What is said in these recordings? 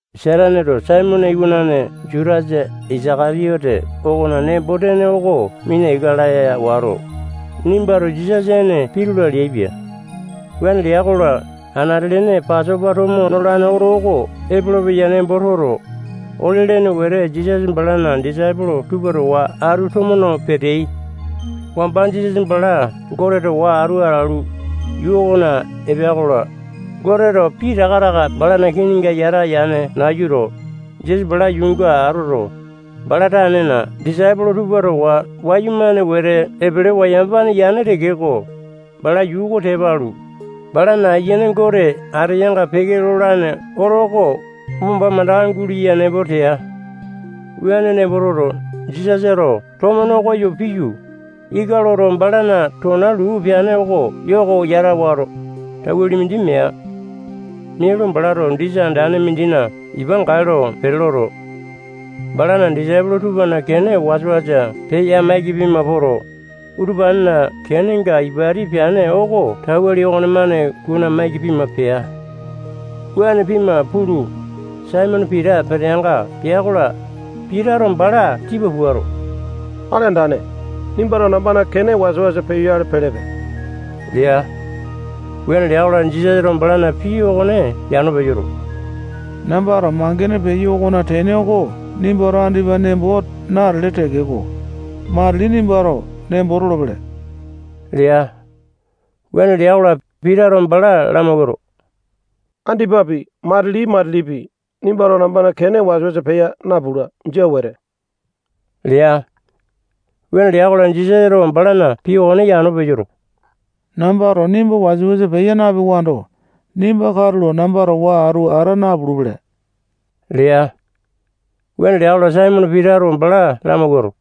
Sataneto Saimone iwanane Jutasa Isaka-tiyote okona nembo-tene oko mina ika laya wato, nimbato Jisasa ene pitula leaipia. Wuane lea-kola, anate-lene Pasopa tomo nolane oto oko epolopeya nembo toto, ole-lene wete Jisasa balana disaipolo tupa towa atu tomo no peteai. Wamba Jisasa bala Gote towa atu atalu, yuu okona epea-kola, Goteto pitaka taka balana kininga yata yane nayuto, Jisasa bala yuunga atoto, bala tanena disaipolo tupa towa wayumane wete epelewa yamapane yane tekeko, bala yuu oko tepa alu, balana Ayiane Gote ateyanga peke lolane oto oko wamba mandaka guleya nembo tea. Wuane nembo toto, Jisasato tomo nokoyo piyu, ika loto, balana tona luu peane oko yoko yata wato, tauwali mindi mea. Mialu, balato disa andane mindina ipa gae lo pete loto, balana disaipolo tupana kene wasa-wasa peya-maiki pima poto, utupanena kenenga ipati peane oko tauwali okonemane kuna-maiki pima pea. Wuane pima pulu, Saimone Pita peteanga pea-kola, Pitato bala tipa puato, Akali Andane, nimbato nambana kene wasa-wasa peyoyale pelepe lea. Wuane lea-kola, Jisasato balana pii okone yano peyoto, nambato mangene peyo okona tene oko nimbato andipa nembo natele tekeko, matili nimbato nembo tolopele lea. Wuane lea-kola, Pitato bala lamawuato, andipapi, matili-matilipi, nimbato nambana kene wasa-wasa peya napula. Jia wete lea. Wuane lea-kola, Jisasato balana pii okone yano peyoto, nambato nimba wasa-wasa peya napewando, nimba katulo namba towa atu ata napulupele lea. Wuane lea-kola, Saimone Pitato bala lamawuato,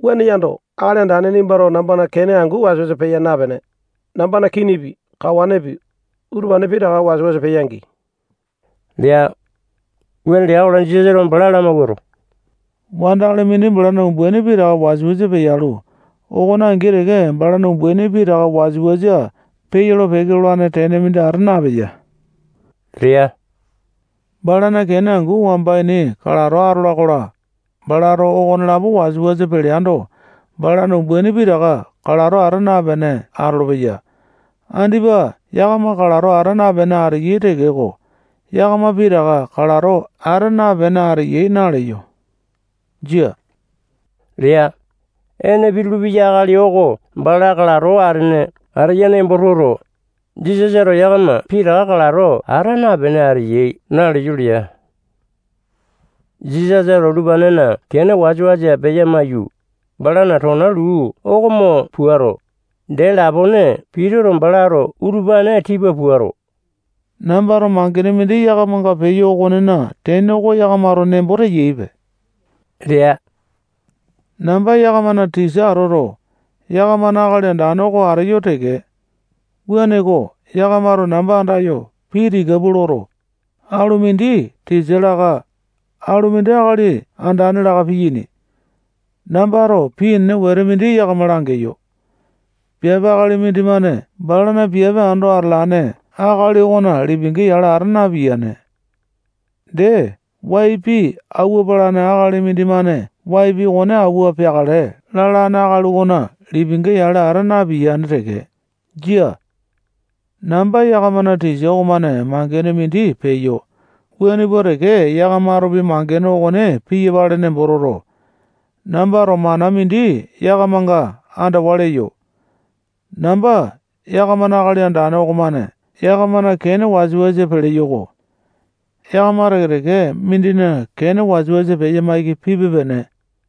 wuane yando, Akali Andane nimbato nambana kene angu wasa-wasa peya napene, nambana kinipi, kawanepi, utupane pitaka wasa-wasa peya-gii lea. Wuane lea-kola, Jisasato bala lamawuato, wandakali mindi balana umbaini pitaka wasa-wasa peyalu, okone angi teke balana umbaini pitaka wasa-wasa peyolo-peke lolane tene mindi ata napeya lea. Balana kene angu wamba ini kalato atola-kola, balato okonelapo wasa-wasa peleando, balana umbaini pitaka kalato ata napene atolopeya. Andipa yakama kalato ata napene ateyai tekeko, yakama pitaka kalato ata napene ateyai naleyo. Jia lea. Ene pitulu-peya akali oko bala kalato atene ateya nembo toto, Jisasato yakama pitaka kalato ata napene ateyai naleyo lea. Jisasato utupanena kene wasa-wasa peya-maiyu, balana tona luu oko mo puato, dee lapone pitulu-peke lea. Pituto, balato utupane tipa puato, nambato mangene mindi yakamanga peyo okonena tene oko yakamato nembo teyaipe lea. Namba yakamana tisa atoto, yakamana Akali Andane oko ateyo teke. Wuaneko, yakamato namba andayo pii tika pua loto, alumindi tisa laka, alumindi Akali Andane laka piyaini. Nambato pii enene wetete mindi yakama langeyo. Piape akali mindimane balana piape ando atalane akali okona lipinga yale ata napiyane. Dee, wai pii awua palane akali mindimane wai pii okone awua peakale lalane akali okona lipinga yale ata napiyane teke. Jia. Namba yakamana tisa okomane mangene mindi peyo, wuane pua teke yakamatopi mangene okone piyapale nembo toto, nambato mana mindi yakamanga andawa leyo. Namba yakamana Akali Andane okomane yakamana kene wasa-wasa peleyo-ko. Yakama teke-teke mindina kene wasa-wasa peya maiki pipe-pene.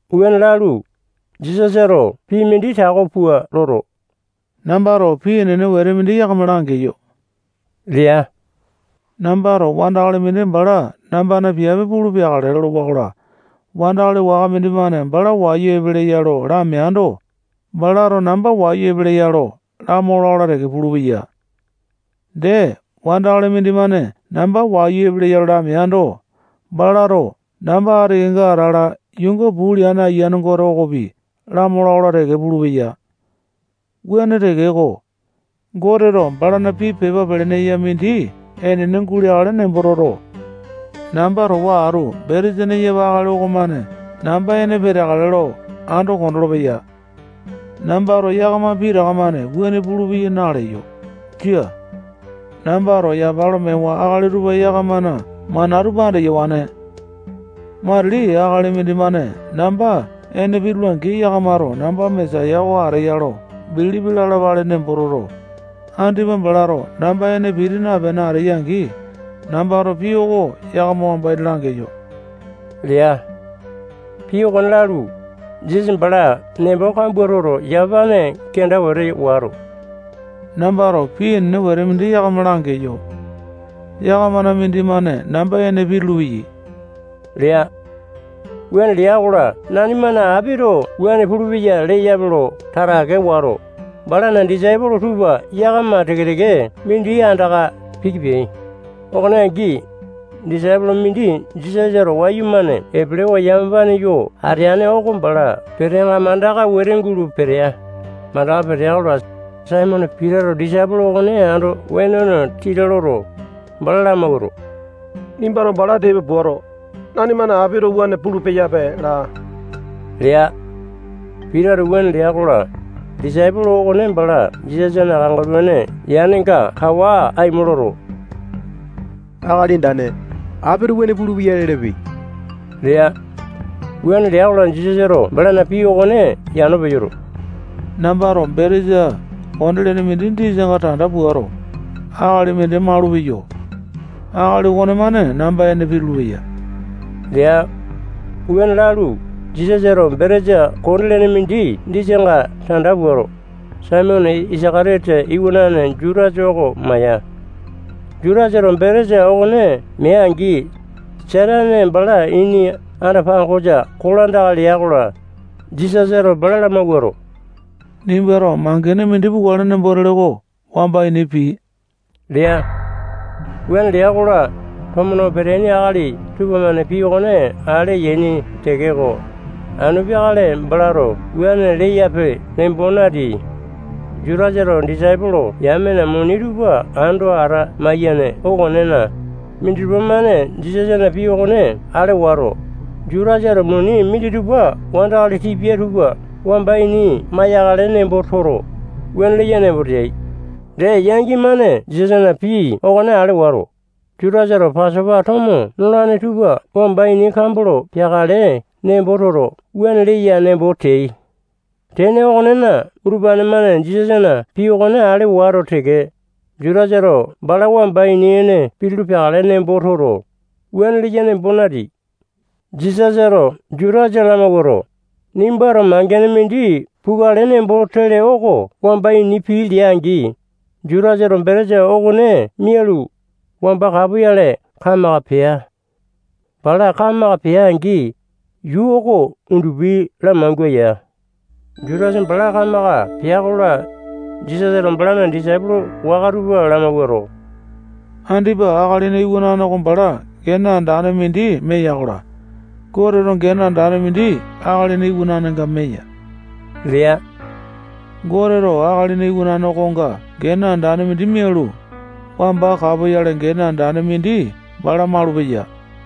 Wuane lalu, Jisasato pii mindi tako pua loto, nambato pii enene wete mindi yakama langeyo lea. Nambato wandakali mindi bala nambana piape pulu peakale lolowa-kola, wandakali waka mindimane bala wayu epeleya lo lameando, balato namba wayu epeleya lo lamola-kola teke pulupeya. Dee, wandakali mindimane namba wayu epeleya lo lameando, balato namba ati kenga atala yuunga puu leane Ayiane Gote okopi lamola-kola teke pulupeya. Wuane tekeko, Goteto balana pii pepa pelene eya mindi enene guleakale nembo toto, namba towa atu betesa neyapa akali okomane namba ene peteakale lo ando kondolo-peya. Nambato yakama pitaka-mane wuane pulupeyai naleyo. Jia. Nambato yapa lo mewa akali tupa yakamana mana tupa andeyawane. Matili akali mindimane namba ene pitula-angi, yakamato namba Mesaya oko ateya lo bilipi lalapale nembo toto, andipa balato namba ene piti napene ateya-angi, nambato pii oko yakama wamba ini langeyo lea. Pii okone lalu, Jisasa bala nembo kambua toto, yamapane kenda wete wato, nambato pii enene wete mindi yakama langeyo. Yakamana mindimane namba ene pitulu-peyai lea. Wuane lea-kola, nanimana apito wuane pulupeya leyape lo tatake wato, balana disaipolo tupa yakama teke-teke mindi andaka piki peai. Okone angi, disaipolo mindi Jisasato wayumane epelewa yamapane yo ateane oko bala peteanga mandaka wete gulo petea. Mandaka petea-kola, Saimone Pitato disaipolo okone ando wenone titi loto, bala lamawuato, nimbato bala tipa puato, nanimana apito wuane pulu-peyape laa lea. Pitato wuane lea-kola, disaipolo okone bala Jisasana kangaluane yanenga kawa aimo loto, Akali Andane, apito wuane pulupeya lelepe lea. Wuane lea-kola, Jisasato balana pii okone yano peyoto, nambato betesa konde-lene mindi disanga tanda puato, akali mindi malupeyo. Akali okonemane namba ene pitulu-peya lea. Wuane lalu, Jisasato betesa konde-lene mindi disanga tanda puato, Saimone Isaka-tiyote iwanane Jutasa oko maya. Jutasato betesa okone mea-angi, Satane balana ini anda-pangosa kolandaka lea-kola, Jisasato bala lamawuato, nimbato mangene mindi pukale nembo tele oko wamba ini pii lea. Wuane lea-kola, tomo no peteaini akali tupamane pii okone ale yaini tekeko, anu peakale balato wuane leyape nembo nateai. Jutasato disaipolo yamena muni tupa ando ata-maiyane okonena, minditupa-mane Jisasana pii okone ale wato, Jutasato muni minditupa wandakali tipia tupa wamba ini maiyakale nembo toto, wuane leya nembo teai. Dee, yangi-mane Jisasana pii okone ale wato, Jutasato Pasopa tomo nolane tupa wamba ini kambolo peakale nembo toto, wuane leya nembo teai. Tene okonena, utupane-mane Jisasana pii okone ale wato teke, Jutasato bala wamba ini ene pitulu peakale nembo toto, wuane leya nembo nateai. Jisasato Jutasa lamawuato, nimbato mangene mindi pukale nembo tele oko wamba ini pii lea-angi, Jutasato betesa okone mialu, wamba kapoyale kamaka pea. Bala kamaka pea-angi, yuu oko undupi lamangua ya. Jutasa bala kamaka pea-kola, Jisasato balana disaipolo waka tupa lamawuato, andipa Akalina Iwanane oko bala gene andane mindi meya-kola, Goteto gene andane mindi Akalina Iwananenga meya lea. Goteto Akalina Iwanane okonga gene andane mindi mialu, wamba kapoyale gene andane mindi bala malupeya.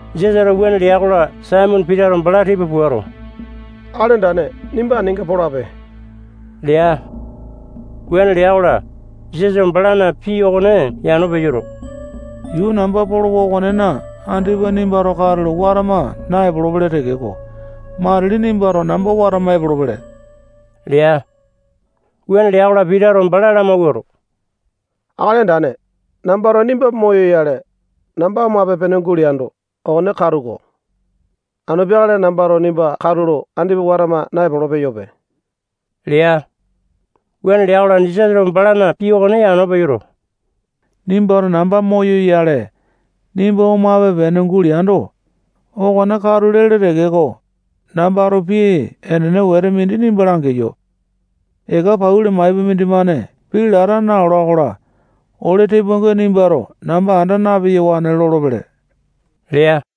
Jisasato wuane lea-kola, Saimone Pitato bala tipa puato, Akali Andane, nimba aninga polape lea. Wuane lea-kola, Jisasato balana pii okone yano peyoto, yuu namba polowa okonena andipa nimbato katulo watama naepolo-pele tekeko, matili nimbato namba watama epolopele lea. Wuane lea-kola, Pitato bala lamawuato, Akali Andane, nambato nimba moyoyale, namba omape-pene guleando, okone katu-ko. Anu peakale nambato nimba katulo andipa watama naepolo-peyope lea. Wuane lea-kola, Jisasato balana pii okone yano peyoto, nimbato namba moyoyale, nimba omape-pene guleando, okone katu lele tekeko, nambato pii enene wete mindi nimba langeyo. Eka pauli maipa mindimane pii lata naola-kola, ole tepoainga nimbato namba anda na-peyawane lolopele lea.